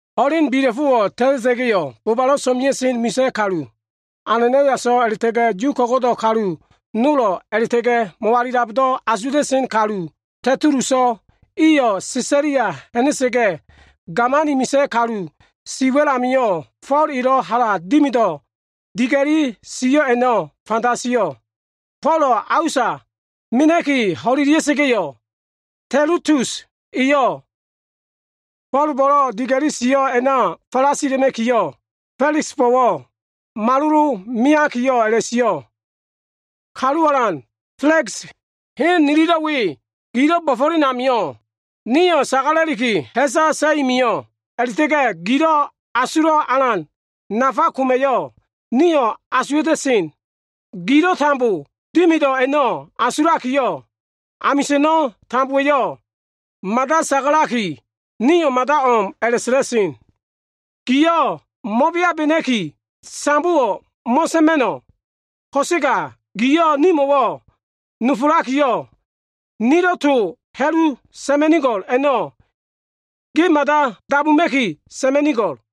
Ho꞉len bila꞉fo꞉wo꞉ ta꞉ta꞉ga꞉yo꞉, bobalo꞉ so꞉mea꞉sen misa꞉ kalu, Ananaiaso꞉ a꞉la꞉ta꞉ga꞉ Yu ko꞉go꞉do꞉ kalu nolo꞉ a꞉la꞉ta꞉ga꞉ mo꞉walilabdo꞉ asuwa꞉ta꞉sen kalu Tetuluso꞉, iyo꞉ Sesalia ha꞉na꞉sa꞉ga꞉, gamani misa꞉ kalu si wa꞉l amio꞉ Fo꞉l elo꞉ hala dimido꞉ diga꞉li sio꞉ a꞉no꞉ fanda sio꞉. Folo꞉ a usa mena꞉ki ho꞉lelia꞉sa꞉ga꞉yo꞉, Tetulus eyo꞉ Fo꞉lbo꞉lo꞉ diga꞉li sio꞉ a꞉na falasila꞉ma꞉kiyo꞉, Fela꞉ksbo꞉wo꞉ malolomeakiyo꞉ a꞉la꞉sio꞉, “Kalu alan Fela꞉ks, hen nililo꞉ we gilo꞉ bo꞉fo꞉len amio꞉, nio꞉ sagala꞉liki ha꞉sa sa꞉i mio꞉ a꞉la꞉ta꞉ga꞉ gilo꞉ asulo꞉ alan nafa koma꞉yo꞉ nio꞉ asuwa꞉ta꞉sen. Gilo꞉ dimido꞉ a꞉no꞉ tambo asulakiyo꞉, amisa꞉no꞉ tambowa꞉yo꞉ mada sagalaki, nio꞉ mada o꞉m a꞉la꞉sa꞉la꞉sen. Gio꞉ mo꞉beabena꞉ki, sambowo꞉ mo꞉sa꞉ma꞉no꞉ ko꞉sega giyo꞉ nimo꞉wo꞉ nofolakiyo꞉, nilo꞉ to ha꞉lu sa꞉ma꞉nigo꞉l a꞉no꞉ ge mada dabuma꞉ki sa꞉ma꞉nigo꞉l.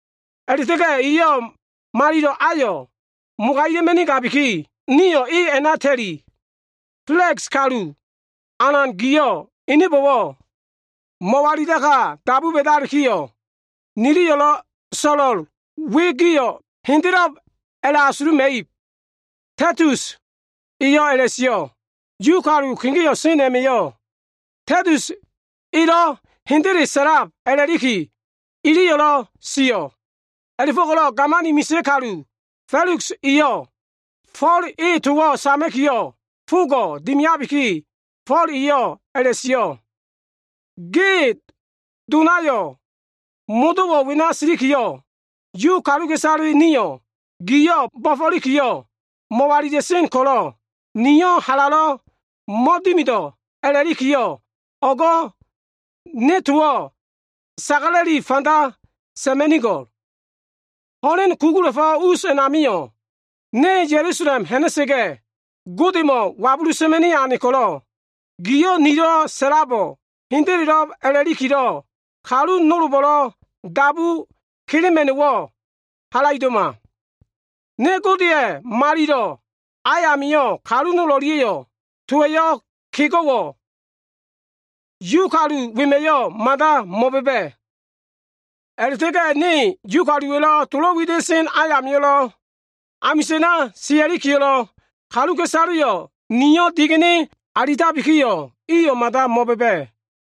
A꞉la꞉ta꞉ga꞉ eyo꞉ malilo꞉ ayo꞉ mogagima꞉nigabiki, nio꞉ e a꞉na ta꞉li. Fela꞉ks, Kalu alan giyo꞉ enebo꞉wo꞉ mo꞉walilaka dabu ba꞉dalikiyo꞉, nililo꞉ so꞉lo꞉l we, gio꞉ hendelelo꞉b a꞉la꞉asuluma꞉ib.” Tetulus eyo꞉ a꞉la꞉sio꞉. Yu kalu kegeo꞉ sen a꞉ma꞉yo꞉ Tetulus eyo꞉ hendele sa꞉lab a꞉la꞉likiyo꞉, iliyo꞉lo꞉ sio꞉. A꞉la꞉fo꞉ko꞉lo꞉ gamani misa꞉ kalu Fela꞉ks eyo꞉ Fo꞉l e towo꞉ sama꞉kiyo꞉ fogo꞉ dimiabiki, Fo꞉l eyo꞉ a꞉la꞉sio꞉, “Ge donayo꞉ modo꞉wo꞉ wena silikiyo꞉, Yu kaluka꞉isale nio꞉, giyo꞉ bo꞉fo꞉likiyo꞉ mo꞉walila꞉sen ko꞉lo꞉, niyo꞉ halalo꞉ mo꞉dimido꞉ a꞉la꞉likiyo꞉, o꞉go꞉ ne towo꞉ sagala꞉li fanda sa꞉ma꞉nigo꞉l. Ho꞉len kugula꞉fo꞉ us a꞉namio꞉, ne Ya꞉lusalem ha꞉na꞉sa꞉ga꞉, Godemo꞉ wabulu sa꞉ma꞉ni ane ko꞉lo꞉, giyo꞉ nilo꞉ sa꞉labo꞉ hendelelo꞉b a꞉la꞉likilo꞉, kalu nolbo꞉lo꞉ dabu kelema꞉no꞉wo꞉ halaido꞉ma. Ne Godeya꞉ malilo꞉ a amio꞉ kalu nol o꞉lia꞉yo꞉ towa꞉lo꞉ kego꞉wo꞉, Yu kalu wema꞉yo꞉ mada mo꞉ba꞉ba꞉. A꞉la꞉ta꞉ga꞉ ne Yu kaluwa꞉lo꞉ tolo꞉ wida꞉sen ayamio꞉lo꞉, amisa꞉na sia꞉likiyo꞉lo꞉, kaluka꞉isaleyo꞉ ni digene alitabikiyo꞉, iyo꞉ mada mo꞉ba꞉ba꞉.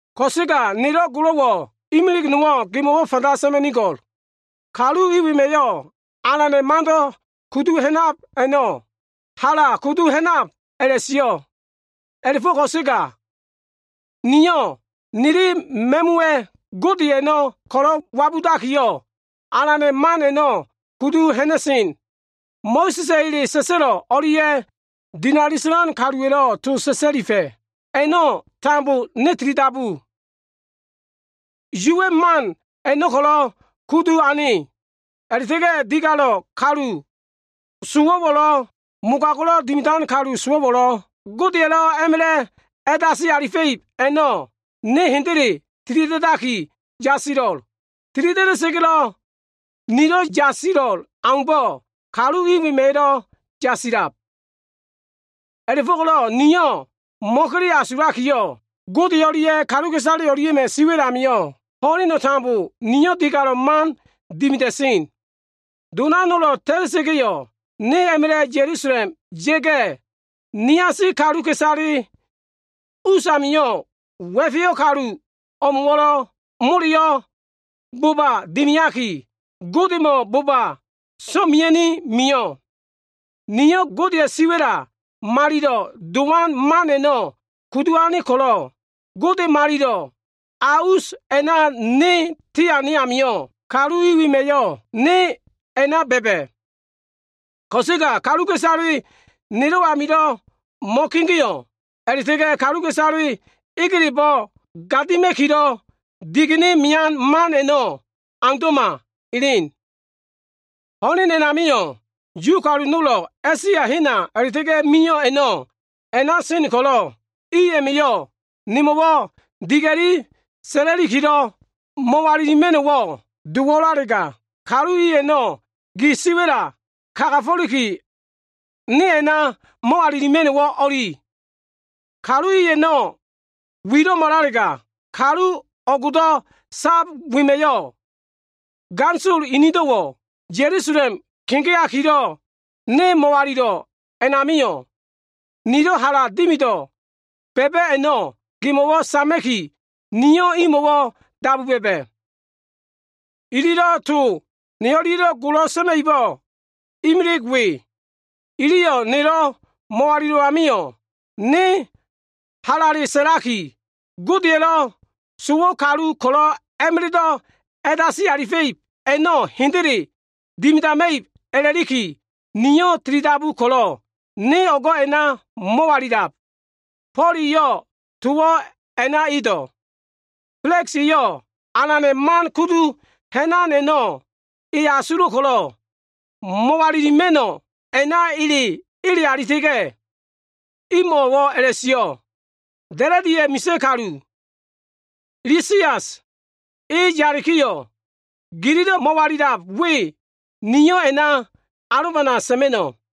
Ko꞉sega nelo꞉ golo꞉wo꞉ imilig nowo꞉ gemo꞉wo꞉ fanda sa꞉ma꞉nigo꞉l. Kalu i wema꞉yo꞉ Alana꞉ Mando꞉ kudu ha꞉nab a꞉no꞉ hala kudu ha꞉nab a꞉la꞉sio꞉. A꞉la꞉fo꞉ ko꞉sega, niyo꞉ nili ma꞉muwa꞉ Gode a꞉no꞉ ko꞉lo꞉ wabudakiyo꞉, Alana꞉ man a꞉no꞉ kudu ha꞉na꞉sen. Mo꞉sa꞉sa꞉ ele sa꞉sa꞉lo꞉ o꞉lia꞉ dinali sa꞉lan kaluwa꞉lo꞉ to sa꞉sa꞉lifa꞉ a꞉no꞉ tambo niyo꞉ tilidabu. Yuwa꞉ man a꞉no꞉ ko꞉lo꞉ kudu ane. A꞉la꞉ta꞉ga꞉ digalo꞉ kalu sowo꞉wo꞉lo꞉, mogago꞉lo꞉ dimidan kalu sowo꞉wo꞉lo꞉ Godeya꞉lo꞉ a꞉ma꞉la꞉ a꞉dasi alifa꞉ib a꞉no꞉ niyo꞉ hendele tilida꞉daki yasilo꞉l. Tilida꞉da꞉sa꞉ga꞉lo꞉ nilo꞉ yasilo꞉l aumbo꞉, kalu i wema꞉yo꞉lo꞉ a꞉la꞉ka yasilab. A꞉la꞉fo꞉ko꞉lo꞉ niyo꞉ mo꞉kele asuluma꞉kiyo꞉, Gode o꞉lia꞉ kaluka꞉isale o꞉lia꞉ma꞉ siwa꞉l amio꞉, ho꞉leno꞉ tambo niyo꞉ digalo꞉ man dimida꞉sen. Dona nolo꞉ ta꞉ta꞉sa꞉ga꞉yo꞉, ne a꞉ma꞉la꞉ Ya꞉lusalem ya꞉ga꞉, niasi kaluka꞉isale usamilo꞉ wa꞉feyo꞉ kalu o꞉mo꞉wo꞉ moleyo꞉ boba dimiaki, Godemo꞉wo꞉ boba so꞉mea꞉ni mio꞉. Niyo꞉ Godeya꞉ siwa꞉la nafale dowan man a꞉no꞉ kudu ane ko꞉lo꞉, ne Godeya꞉ malilo꞉ a baya sen amio꞉, kalu i wema꞉yo꞉ ne a꞉na ba꞉ba꞉. Ko꞉sega kaluka꞉isaleyo꞉ nelo꞉ amio꞉ mo꞉kegeo꞉ a꞉la꞉ta꞉ga꞉ kaluka꞉isale egelebo꞉ gadima꞉kilo꞉ digene mean man a꞉no꞉ aundo꞉ma elen. Ho꞉len a꞉namio꞉, Yu kalu nolo꞉ A꞉sia hena a꞉la꞉ta꞉ga꞉ mio꞉ a꞉no꞉ a꞉na sen ko꞉lo꞉ i a꞉ma꞉yo꞉ nemo꞉wo꞉ diga꞉li sa꞉lakilo꞉ mo꞉walilima꞉no꞉wo꞉ dowo꞉lalega, kalu i a꞉no꞉ gi siwa꞉la kagafo꞉liki, ne a꞉na mo꞉walilima꞉no꞉wo꞉ o꞉li. Kalu i a꞉no꞉ wilo꞉malalega, kalu o꞉go꞉do꞉ sab wema꞉yo꞉, ganisolo inido꞉wo꞉ Ya꞉lusalem kegeakilo꞉ ne mo꞉walilo꞉ a꞉namio꞉, nilo꞉ hala dimido꞉ ba꞉ba꞉ a꞉no꞉ gemo꞉wo꞉ sama꞉ki, giyo꞉ imo꞉wo꞉ dabu bo꞉ba. Ililo꞉ to ne o꞉lia꞉lo꞉ golo sa꞉ma꞉ibo꞉ imilig we. Iliyo꞉ nelo꞉ mo꞉walilo꞉ amio꞉, niyo꞉ halale sa꞉laki, ‘Godeya꞉lo꞉ sowo꞉ kalu ko꞉lo꞉ a꞉ma꞉la꞉do꞉ a꞉dasi alifa꞉ib a꞉no꞉ hendele dimidama꞉ib a꞉la꞉liki, niyo꞉ tilidabu ko꞉lo꞉ ne o꞉go꞉ a꞉na mo꞉walilab.’” Fo꞉l eyo꞉ towo꞉ a꞉na edo꞉. Fela꞉ks eyo꞉ Alana꞉ Man kudu ha꞉nan a꞉no꞉ e asulo꞉ ko꞉lo꞉ mo꞉walilima꞉no꞉wo꞉ a꞉na ele alita꞉ga꞉, imo꞉wo꞉ a꞉la꞉sio꞉, “Da꞉la꞉diya꞉ misa꞉ kalu, Lisias, e yalikiyo꞉, gililo꞉ mo꞉walilab we, niyo꞉ a꞉na alobana sa꞉ma꞉no꞉.”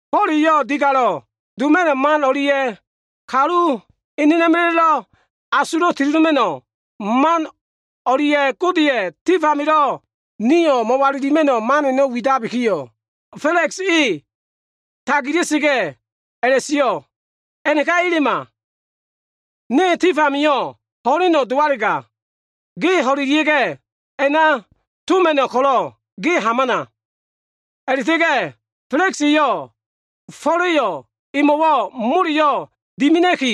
Fo꞉l eyo꞉ digalo꞉ doma꞉no꞉ man o꞉lia꞉ kalu enena꞉ma꞉la꞉lo꞉ asulo꞉ tilidoma꞉no꞉ man o꞉lia꞉ Godeya꞉ tif amilo꞉ nio꞉ mo꞉walilima꞉no꞉ man a꞉no꞉ widabikiyo꞉, Fela꞉ks e tagila꞉sa꞉ga꞉, a꞉la꞉sio꞉, “A꞉naka elema! Ne tif amio꞉ ho꞉leno꞉ dowalega, ge ho꞉ida꞉sa꞉ga꞉ a꞉na toma꞉no꞉ ko꞉lo꞉ ge hamana.” A꞉la꞉ta꞉ga꞉ Fela꞉ks eyo꞉ Fo꞉la꞉yo꞉ emo꞉wo꞉ moleyo꞉ dimina꞉ki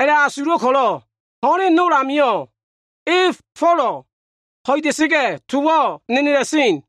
a꞉la꞉asulo꞉ ko꞉lo꞉, ho꞉len nol amio꞉ eyo꞉ Folo꞉ ho꞉ida꞉sa꞉ga꞉, towo꞉ a꞉na nenela꞉sen.